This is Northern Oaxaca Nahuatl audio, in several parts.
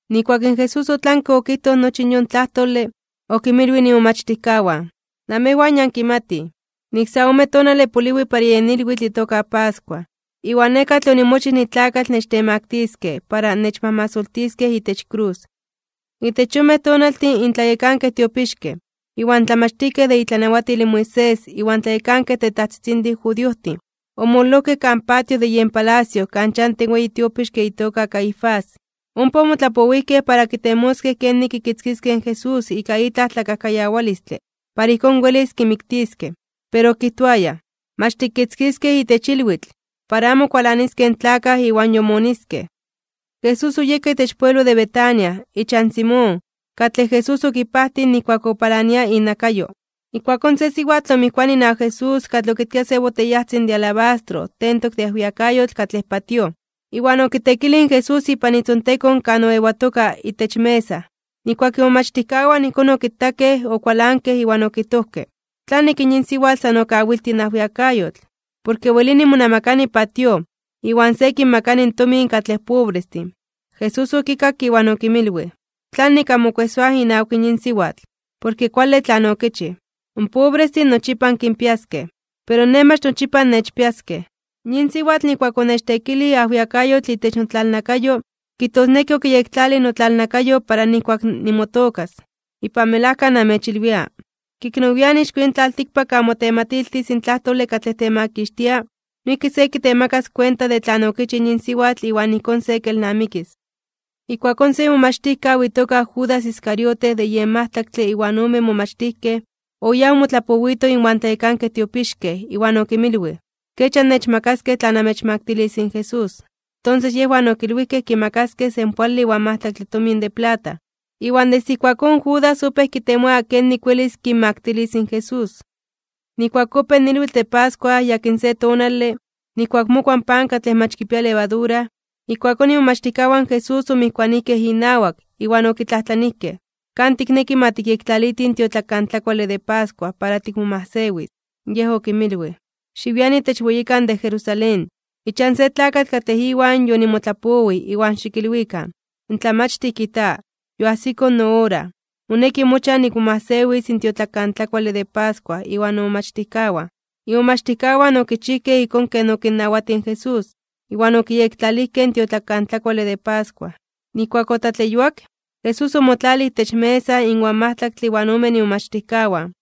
Nijkuak in Jesús otlanke okijtoj nochi in yon tlajtole, okinmilwij imomachtijkawan: ―Namejwan ya ankimatij, nik sa ome tonale poliwi para yen ilwitl itoka pascua. Iwan Nej katlej onimochij nitlakatl nechtemaktiskej (nechtemaktiliskej) para nechmajmasoltiskej itech krus. Itech yonmej tonaltin in tlayekankej tiopixkej, iwan tlamachtijkej de itlanawatil in Moisés iwan tlayekankej tetajtzitzintin judiojtin, omololojkej kan patio de yen palacio kan chanti in weyi tiopixke itoka Caifás. Ompa omotlapowijkej para kitemoskej kenik kikitzkiskej in Jesús ika itlaj tlakajkayawalistle para ijkón welis kimiktiskej. Pero okijtoayaj: ―Mach tikitzkiskej itech ilwitl, para amo kualaniskej in tlakaj iwan yomoniskej. Jesús oyeka itech pueblo de Betania, ichan Simón, katlej Jesús okipajtij nijkuak opalania inakayo. Ijkuakón se siwatl omijkuanij inawak Jesús katlej okitkia se boteyajtzin de alabastro tentok de ajwiakayotl katlej patíoj, iwan okiteekilij in Jesús ipan itzontekon kan oewatoka itech mesa. Nijkuak imomachtijkawan ijkón okitakej, okualankej iwan okijtojkej: ―¿Tlanik yin siwatl san okawiltij in ajwiakayotl? Porke welini monamakani patíoj, iwan se kinmakani in tomin katlej pobrestin. Jesús okikakke, iwan okinmilwij: ―¿Tlanik anmokuejsoaj inawak yin siwatl? Porke kuale tlan okichij. In pobrestin nochipa ankinpiaskej, pero Nej mach nochipa annechpiaskej. Yin siwatl nijkuak onechteekilij ajwiakayotl itech notlalnakayo, kijtosneki okiyektlalij notlalnakayo para nijkuak nimotookas. Ipan melajka namechilwia, ke ik nowian (nian nepa) ixko yin tlaltikpak kan motematiltis in tlajtole katlej temakixtia, noijki se kitemakas kuenta de tlan okichij in yin siwatl iwan ijkón se kelnamikis. Ijkuakón se imomachtijkaw itoka Judas Iscariote de yen majtlaktle iwan omen momachtijkej, oyáj omotlapowito inwan tlayekankej tiopixkej iwan okinmilwij: ―¿Kech annechmakaskej tla namechmaktilis in Jesús? Tonses yejwan okilwijkej kimakaskej senpoale iwan majtlaktle tomin de plata. Iwan desde ijkuakón Judas opéj kitemoa kenik welis kinmaktilis in Jesús. Nijkuak opéj in ilwitl de pascua yakin se tonale, nijkuak mokua in pan katlej mach kipia levadura, ijkuakón imomachtijkawan Jesús omijkuanijkej inawak, iwan okitlajtlanijkej: ―¿Kan tikneki ma tikyektlalitij in tiotlakantlakuale de pascua para tikmomajsewis? Yej okinmilwij: ―Xiwian itech weyikan de Jerusalén, ichan se tlakatl katlej iwan yonimotlapowij iwan xikilwikan: “In Tlamachtij kijta: Yoajsiko noora, moneki mochan nikmomajsewis in tiotlakantlakuale de pascua iwan nomomachtijkawan.” Imomachtijkawan okichijkej ijkón ken okinnawatij in Jesús, iwan okiyektlalijkej in tiotlakantlakuale de pascua. Nijkuak otlatleyuak, Jesús omotlalij itech mesa inwan majtlaktle iwan omen imomachtijkawan.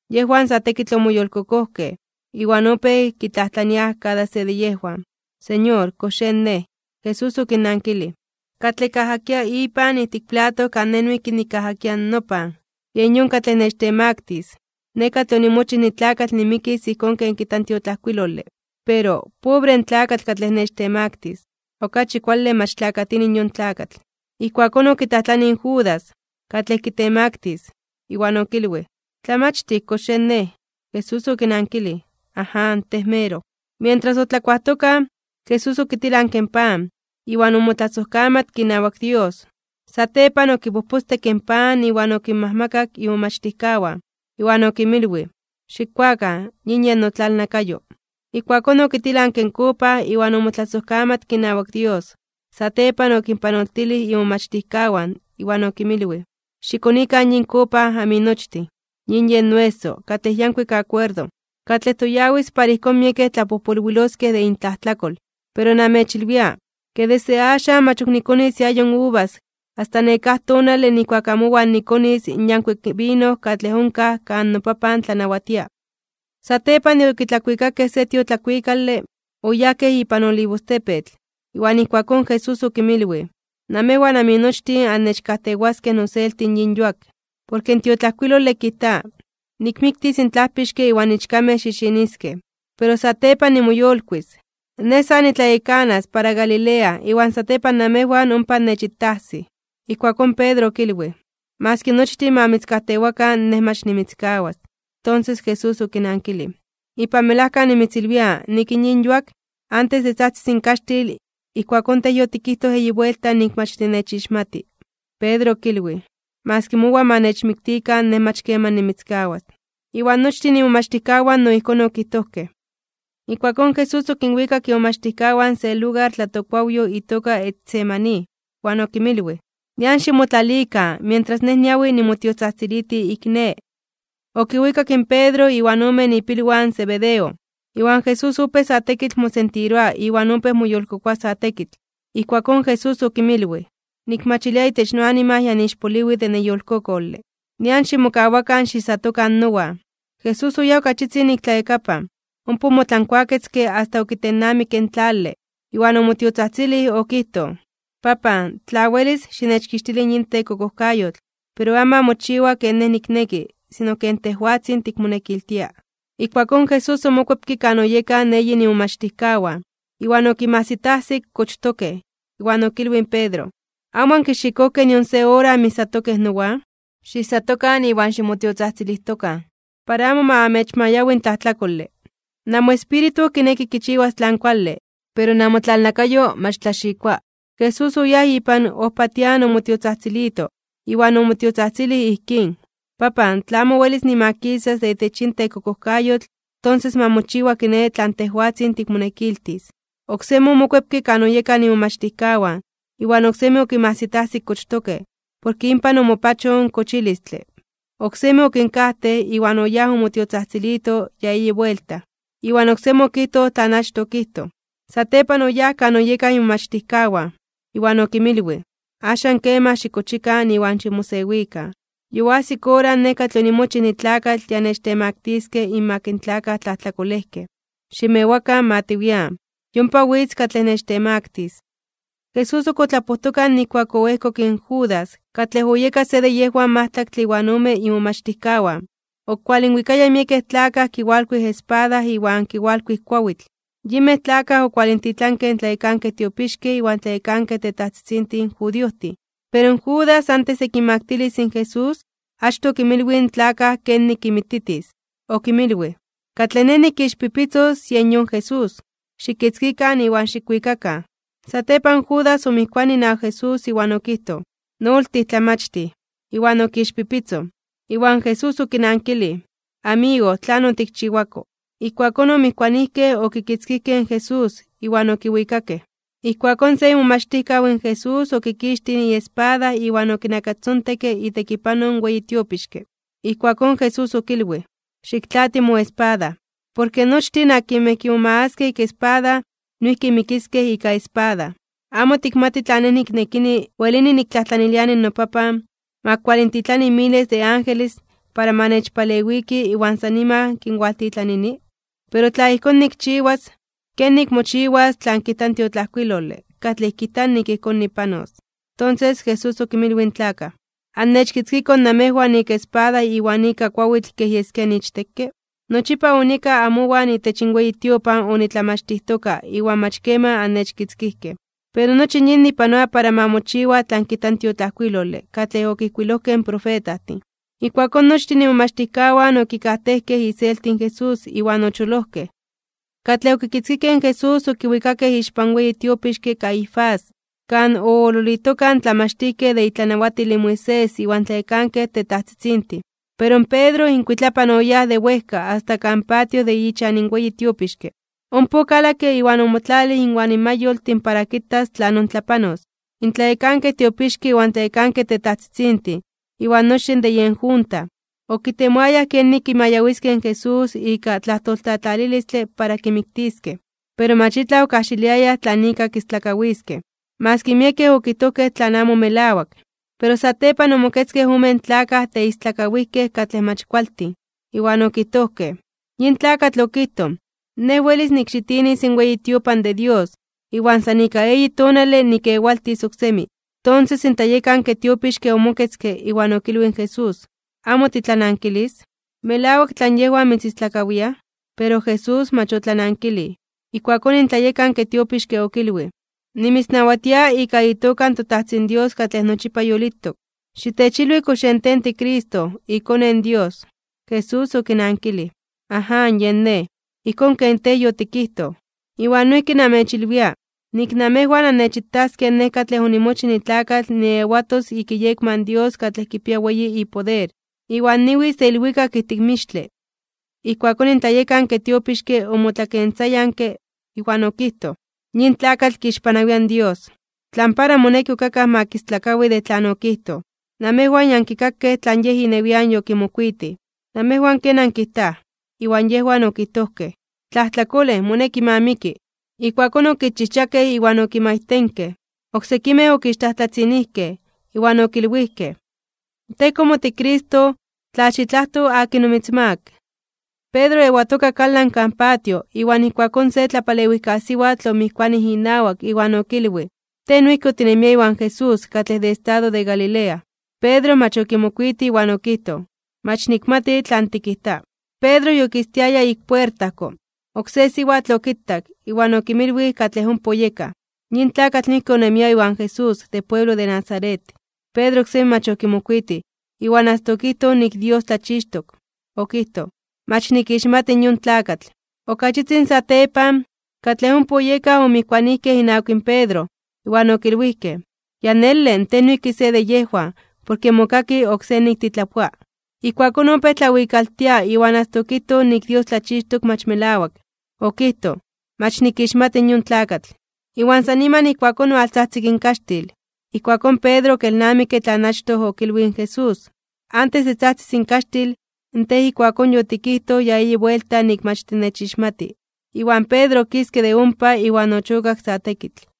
Yejwan sa tekitl omoyolkokojkej, iwan opéj kitlajtlaniaj kada se de yejwan: ―Señor, ¿kox yen nej? Jesús okinnankilij: ―Katlej kajakia ipan ijtik plato kan Nej noijki nikajakia nopan, yen yon katlej nechtemaktis (nechtemaktilis). Nej katlej onimochij nitlakatl nimikis ijkón ken kijta in tiotlajkuilole. Pero ¡pobre in tlakatl katlej nechtemaktis! Okachi kuale mach tlakatini yon tlakatl. Ijkuakón okitlajtlanij in Judas, katlej kitemaktis, iwan okilwij: ―Tlamachtij, ¿kox yen nej? Jesús okinankilij: ―Aján, tej meroj. Mientras otlakuajtokaj, Jesús okitilanke in pan, iwan omotlasojkamatke inawak Dios, satepan okipojpostekke in pan iwan okinmajmakak imomachtijkawan, iwan okinmilwij: ―Xikkuakan. Yin yen notlalnakayo. Ijkuakón okitilanke in kopa, iwan omotlasojkamatke inawak Dios, satepan okinpanoltilij imomachtijkawan, iwan okinmilwij: ―Xikonikan yin kopa aminochtin. Yin yen noeso, katlej yankuik akuerdo, katlej toyawis para ijkón miekej tlapojpolwiloskej de intlajtlakol. Pero namechilwia, ke desde axan mach ok nikonis iayo uvas asta nekáj tonale nijkuak amowan nikonis iayo uvas yankuik katlej onkaj kan noPapan tlanawatia. Satepan de okitlakuikakej se tiotlakuikale, oyajkej ipan Olivostepetl. Iwan ijkuakón Jesús okinmilwij: ―Namejwan aminochtin annechkajtewaskej noselti yin yuak, porke in tiotlajkuilole kijta: “Nikmiktis in tlajpixke iwan ichkamej xixiniskej.” Pero satepan de nimoyolkuis (nimoyolitis), Nej sa nitlayekanas para Galilea iwan satepan namejwan ompa annechitajsij. Ijkuakón Pedro, okilwij: ―Maski nochtin ma mitzkajtewakan, nej mach nimitzkawas. Tonses Jesús okinankilij: ―Ipan melajka nimitzilwia nik yin yuak, antes de tzajtzis in kaxtil, ijkuakón tej yotikijtoj eyi buelta nik mach tinechixmati. Iwan Pedro okilwij: ―Maski mowan ma nechmiktikan, nej mach keman nimitzkawas. Iwan nochtin imomachtijkawan no ijkón okijtojkej. Ijkuakón Jesús okinwikak imomachtijkawan se lugar tlatokkuawyoj itoka Getsemaní, iwan okinmilwij: ―Nian ximotlalikan, mientras Nej niawi nimotiotzajtziliti ik ne. Okiwikak in Pedro iwan omen ipilwan in Zebedeo, iwan Jesús opéj sa tekitl mosentiroa iwan opéj moyolkokoa sa tekitl. Ijkuakón Jesús okinmilwij: ―Nikmachilia itech noanima ya niixpoliwi de neyolkokole. Nian ximokawakan xiijsatokan nowan. Jesús oyáj ok achitzin ik tlayakapan, ompa omotlankuaketzke asta okitennamikke in tlale, iwan omotiotzajtzilij okijtoj: ―Papan, in tla welis, xinechkixtili in yin tekokojkayotl. Pero amo ma mochiwa ken Nej nikneki, sino ken tejwatzin tikmonekiltia. Ijkuakón Jesús omokuepke kan oyekaj eyin imomachtijkawan, iwan okinmajsitajsik kochtokej. Iwan okilwij in Pedro: ―¿Amo ankixikojkej nion se ora anmijsatokej nowan? Xiijsatokan iwan ximotiotzajtzilijtokan, para amo ma amechmayawi in tlajtlakole. Namoespíritu kineki kichiwas tlan kuale, pero namotlalnakayo mach tlaxikoa. Jesús oyáj ipan ojpatian omotiotzajtzilito, iwan omotiotzajtzilij ijkín: ―Papan, tla amo welis nimakisas de itech yin tekokojkayotl, tonses ma mochiwa kiné tlan tejwatzin tikmonekiltis. Oksemi omokuepke kan oyekaj imomachtijkawan, iwan oksemi okinmajsitajsik kochtokej, porke inpan omopachoj in kochilistle. Oksemi okinkajtej, iwan oyáj omotiotzajtzilito ya eyi buelta, iwan oksemi okijtoj tlan achtoj okijtoj. Satepan oyáj kan oyekaj imomachtijkawan, iwan okinmilwij: ―Axan keman xikochikan iwan ximosewikan. Yoajsik ora, Nej katlej onimochij nitlakatl ya nechtemaktiskej (nechtemaktiliskej) inmak in tlakaj tlajtlakolejkej. Ximewakan, ma tiwian. Yompa witz katlej nechtemaktis. Jesús ok otlapojtoka nijkuak oejkok in Judas, katlej oyeka se de yejwan majtlaktle iwan omen imomachtijkawan, okualinwikaya miekej tlakaj kiwalkuij espada iwan kiwalkuij kuawitl. Yinmej tlakaj okualintitlankej in tlayekankej tiopixkej iwan tlayekankej tetajtzitzintin judiojtin. Pero in Judas antes de kinmaktilis in Jesús, achtoj okinmilwij in tlakaj kenik kinmititis. Okinmilwij: ―Katlej nej nikixpipitzos, yen yon Jesús. Xikitzkikan iwan xikwikakan. Satepan in Judas omijkuanij inawak Jesús iwan okijtoj: ―¡Noltij Tlamachtij! Iwan okixpipitzoj. Iwan Jesús okinankilij: ―Amigo, ¿tlan otikchiwako? Ijkuakón omijkuanijkej okitzkijkej in Jesús, iwan okiwikakej. Ijkuakón se imomachtijkaw in Jesús okikixtij iespada iwan okinakastzontekke itekipanoj in weyi tiopixke. Ijkuakón Jesús okilwij: ―Xiktlaati moespada. Porke nochtin akinmej kimomagaskej ika espada, noijki mikiskej ika espada. ¿Amo tikmati tla Nej niknekini, welini niktlajtlaniliani noPapan, ma kualintitlani miles de angelestin para ma nechpalewikij iwan san niman kualintitlanini? Pero tla ijkón nikchiwas, ¿kenik mochiwas tlan kijta tiotlajkuilole, katlej kijta nik ijkón nipanos? Tonses Jesús okinmilwij in tlakaj: ―¿Annechkitzkikoj namejwan ika espada iwan ika kuawitl kej yeskia niichtekke? Nochipa onieka amowan itech in weyi tiopan onitlamachtijtoka iwan mach keman annechkitzkijkej. Pero nochi yin nipanoa para ma mochiwa tlan kijta in tiotlajkuilole katlej okijkuilojkej in profetajtin. Ijkuakón nochtin imomachtijkawan okikajtejkej iselti in Jesús iwan ocholojkej. Katlej okitzkijkej in Jesús okiwikakej ixpan weyi tiopixke Caifás, kan oololitokaj in tlamachtijkej de itlanawatil in Moisés iwan tlayekankej tetajtzitzintin. Pero in Pedro inkuitlapan oyáj de wejka asta kan patio de ichan in weyi tiopixke, ompa okalakke iwan omotlalij inwan mayoltin para kitas tlanon tlapanos. In tlayekankej tiopixkej, iwan tlayekankej tetajtzitzintin, iwan nochtin de yen junta, okitemoayaj kenik kimayawiskej in Jesús ika tlajtoltlatlalilistle para kimiktiskej. Pero mach itlaj okajxiliayaj tlan ika kistlakawiskej, maski miekej okijtojkej tlan amo melawak. Pero satepan omoketzkej omen tlakaj teistlakawijkej katlej mach kualtin, iwan okijtojkej: ―Yin tlakatl okijtoj: “Nej welis nikxitinis in weyi tiopan de Dios, iwan san ika eyi tonale nikkewaltis oksemi.” Tonses in tlayekanke tiopixke omoketzke, iwan okilwij in Jesús: ―¿Amo titlanankilis? ¿Melawak tlan yejwan mitzistlakawiaj? Pero Jesús mach otlanankilij. Ijkuakón in tlayekanke tiopixke okilwij: ―Nimitznawatia ika itoka in toTajtzin Dios katlej nochipa yolitok, xitechilwi kox yen tej tiCristo, iKone in Dios. Jesús okinankilij: ―Aján yen Nej, ijkón ken tej yotikijtoj. Iwan noijki namechilwia, nik namejwan annechitaskej Nej katlej onimochij nitlakatl niewatos ik iyekma in Dios katlej kipia weyi ipoder, iwan niwitz de ilwikak ijtik mixtle. Ijkuakón in tlayekanke tiopixke omotlakentzayanke, iwan okijtoj: ―¡Yin tlakatl kixpanawia in Dios! ¿Tlan para moneki ok akaj ma kistlakawi de tlan yokijtoj? Namejwan ya ankikakej tlan yej inewian yokimokuitij. ¿Namejwan ken ankijtaj? Iwan yejwan okijtojkej: ―¡Tlajtlakolej, moneki ma miki! Ijkuakón okixchijchakej iwan okimaitenkej. Oksekimej okixtlajtlatzinijkej iwan okilwijkej: ―Tej komo tiCristo, ¡tla xitlajto (xikadibinaro) akin omitzmaak! Pedro oewatoka kalan kan patio, iwan ijkuakón se tlapalewijkasiwatl omijkuanij inawak iwan okilwij: ―Tej noijki otinemia iwan Jesús katlej de estado de Galilea. Pedro mach okimokuitij, okijtoj: ―Mach nikmati tlan tikijta. Pedro yokistiaya ik puertajko, oksé siwatl okitak, iwan okinmilwij katlej ompa oyekaj: ―Yin tlakatl noijki onemia iwan Jesús de pueblo de Nazaret. Pedro oksemi mach okimokuitij, iwan asta okijtoj nik in Dios tlachixtok. Okijtoj: ―Mach nikixmati in yon tlakatl. Okachitzin satepan, katlej ompa oyekaj omijkuanijkej inawak in Pedro, iwan okilwijkej: ―Ya nele, tej noijki se de yejwan, porke mokaki oksé nik titlapoa. Ijkuakón opéj tlawikaltia iwan asta okijtoj nik in Dios tlachixtok mach melawak. Okijtoj: ―Mach nikixmati in yon tlakatl. Iwan san niman ijkuakón owaltzajtzik in kaxtil. Ijkuakón Pedro okelnamikke tlan achtoj okilwij in Jesús: “Antes de tzajtzis in kaxtil, tej ijkuakón yotikijtoj ya eyi buelta nik mach tinechixmati.” Iwan Pedro okiske de ompa iwan ochokak sa tekitl.